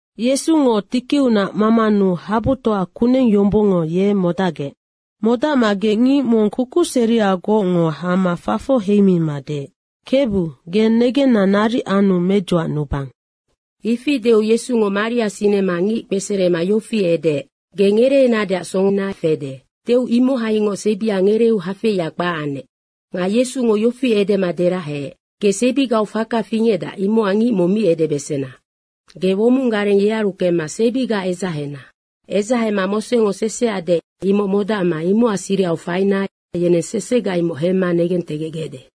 Yesungo tikiunac mamanu habutoa kuneng yombongngo ye modacgec. Modacmagec ngic mong kukuseriagocngo hama fafoc heimima deec, “Kebu, ge negenna naric anu medzuacnubang.” Ifi deu Yesungo maria sinema ngic kpeserema yofi edeec, “Ge ngereenadeac songona fede.” Deu imohaingoc sebia ngereeu hafeia kpac anec. Nga Yesungo yofi edema deraheec, “Ge sebigau faka fingecdac, imocac ngic mong mi edebesena. Ge womong gareng yearu kemma sebiga edzahena. Edzahema Mosengo seseac deec, imoc modacma imocac sirihau faina yeneng sesega imoc hemma negentegecgecde.”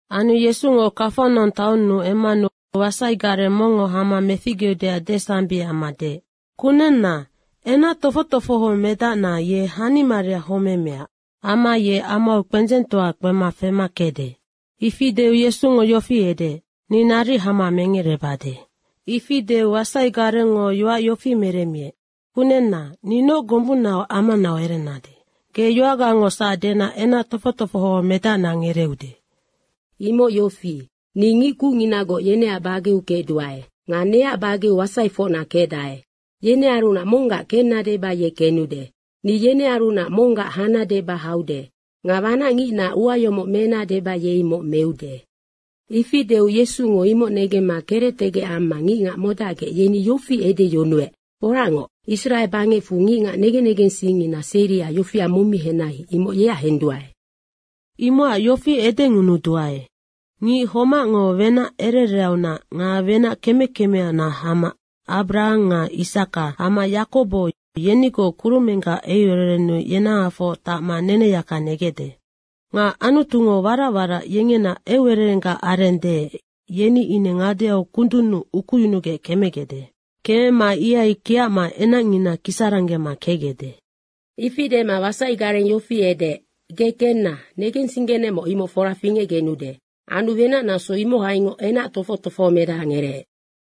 Anu Yesungo Kafanaung taonnu emmanu wasaigareng mongngo hama meficgeudeac desambic amma deec, “Kunenna, enac tofoc tofoho medacna ye hanimaria homemea amma ye amau kpendzengtoa kpema fema kecde.” Ifi deu Yesungo yofi edeec, “Ni naric hama mengerebade.” Ifi deu wasai garengngo yoac yofi meremmiec, “Kunenna, ni noc gombunnaac amawarocnau erenade. Ge yoacgangosac dena enac tofoc tofoho medacna ngereeude. Imoc yofi, ni ngic kucnginagoc yeneac bageu kecduae. Nga neac bageu wasaifocna kecdae. Yenearunac monggac kenna deba ye kenude. Ni yenearunac monggac hana deba haude. Nga wanacngicnaac ua yomoc mena deba ye imoc meude.” Ifi deu Yesungo imoc negemma kerectegec amma ngicngac modacgec, yeni yofi edeyunuec, “Foracngoc, Israe bangecfu ngicngac negen negensingngina seria yofia mong mi henai, imoc yeac henduae. Imocac yofi edengunuduae, ngic homacngo wenac ere ereaunac nga wenac keme kemeaunac hama Abrahang nga Isaka amma Yakobo yenigoc kurumenggac eucererennu yenahafoc tacma neneyaka negecde. Nga Anutungo warac warac yengena eucererenggac areng deec, yeni ine ngadeau kundunnu ukuyunugec kemegecde. Kemema ihai kiacma enacngina kisaranggema kecgecde.” Ifi dema wasaigareng yofi edeec, “Ge kenna, negensinggenecmoc, imoc fora fingecgenude.” Anu wenac naso imohaingoc enac tofoc tofoho medaha ngereec.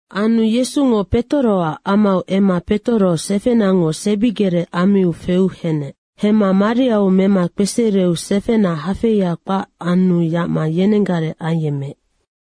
Anu Yesungo Petoroac amau emma Petoro sefenango sebigerec ammiu feu henec. Hemma mariau mema kpesereu sefena hafeia kpac anu yacma yenenggareng ayemmeec.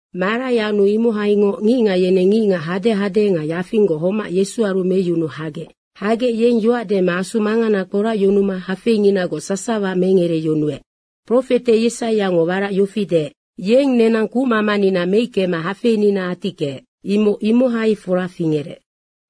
Marai anu imohaingoc ngicngac yeneng ngicngac hadehade nga yafinggoc homac Yesuaru meyunuu hagec. Hagec, yeng yoac dema asu mangana kporacyunuma hafeinginagoc sasawa mengereyunuec. Profete Yesaiango warac yofi deec, “Yeng nenang kucmamanina meickema hafeinina atickeec.” imoc imohai fora fingerec.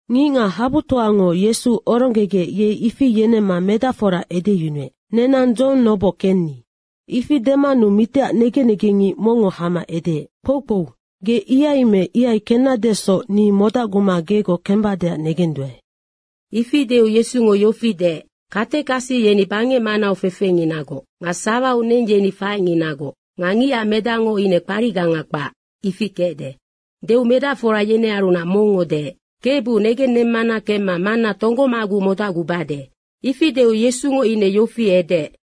Ngicngac habutoango Yesu oronggegec ye ifi yenemma medacfora edeyunuec, “Nenang dzohong noboc kenni.” Ifi demanu mitiac negen negengngic mongngo hama edeec, “Kpoukpou, ge ihai me ihai kennadesoc ni modacguma gegoc kembadeac negenduae.” Ifi deu Yesungo yofi deec, “Katekasi yeni bangec manau fefenginagoc nga sawau neng yeni faecnginagoc nga ngicac Medacngo ine kparicganga kpac, ifi kecde.” Deu medacfora yenearunac mongngo deec, “Kebu, negennemmana kemma manna tonggomaguc modacgubade.” Ifi deu Yesungo ine yofi edeec,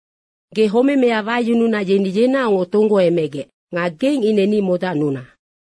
“Ge homemea wayununa yeni yenaocngoc tonggoemegec. Nga geng ine ni modacnuna.”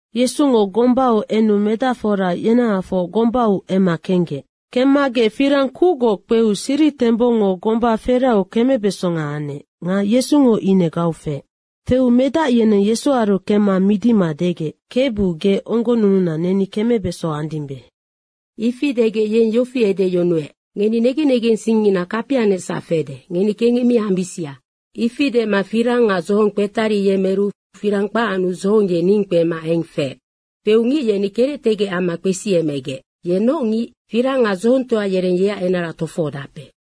Yesungo gombau enu medacfora yenahafoc gombau emma kenggec. Kemmagec firang kucgoc kpeu siritembongngo gomba feraheu kemebesonga anec nga Yesungo ine gau feec. Feu medac yeneng Yesuaru kemma midima degec, “Kebu ge onggonnununa, neni kemebeso andimbe.” Ifi degec yeng yofi edeyunuec, “Ngeni negen negensingngina kapianecsac fede, ngeni kengec mi ambisia.” Ifi dema firang nga dzohong kpetariyemeru firang kpac anu dzohong ye ning kpema eng feec. Feu ngic yeni kerectegec amma kpesiemegec, “Ye noc ngic? Firang nga dzohongtoa yereng yeac enara tofohodape.”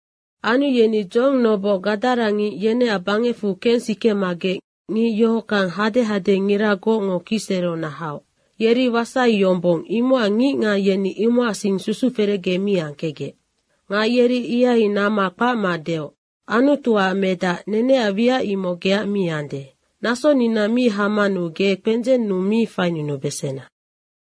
Anu yeni dzohong noboc gadarangic, yeneac bangecfu kensikemagec ngic yohockang hadehadengiragocngo kicsereunac haoc. Yeri wasai yombong, imocac ngicngac yeni imohacsing susuferecge mi angkecgec. Nga yeri ihai namma kpacma deoc, “Anutuac Medac, neneac wiac imoc geac mi ande. Nasonina mi hamanu ge kpendzeng monnu mi fainunubesena.”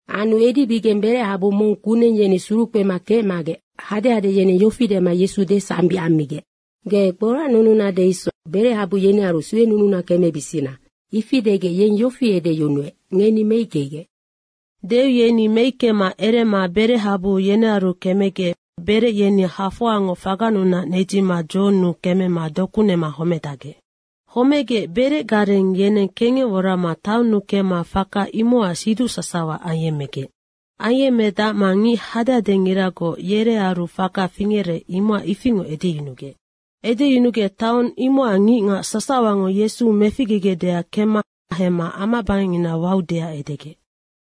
Anu edibigeng berechabu mong kuneng yeni surukpema kecmagec hadehade yeneng yofi dema Yesu desambic ammigec, “Ge kporacnununade isoc, berechabu yenearu suenununa kemebisina.” Ifi degec yeng yofi edeyunuec, “Ngeni meickegec.” Deu yeni meickema erema berechabu yenearu kemegec berec yeni hafoangoc fagannunac nedzima dzohonnu kemema doku nema homedacgec. Homegec berecgareng yeneng kengec worama taonnu kemma faka imocac siduc sasawa ayemmegec. Ayemmedacma ngic hadehadengiragoc yerearu faka fingerec, imocac ifingoc edeyunugec. Edeyunugec taong imocac ngicngac sasawango Yesu meficgegecdeac kemma hemma amabangecngina waudeac edegec.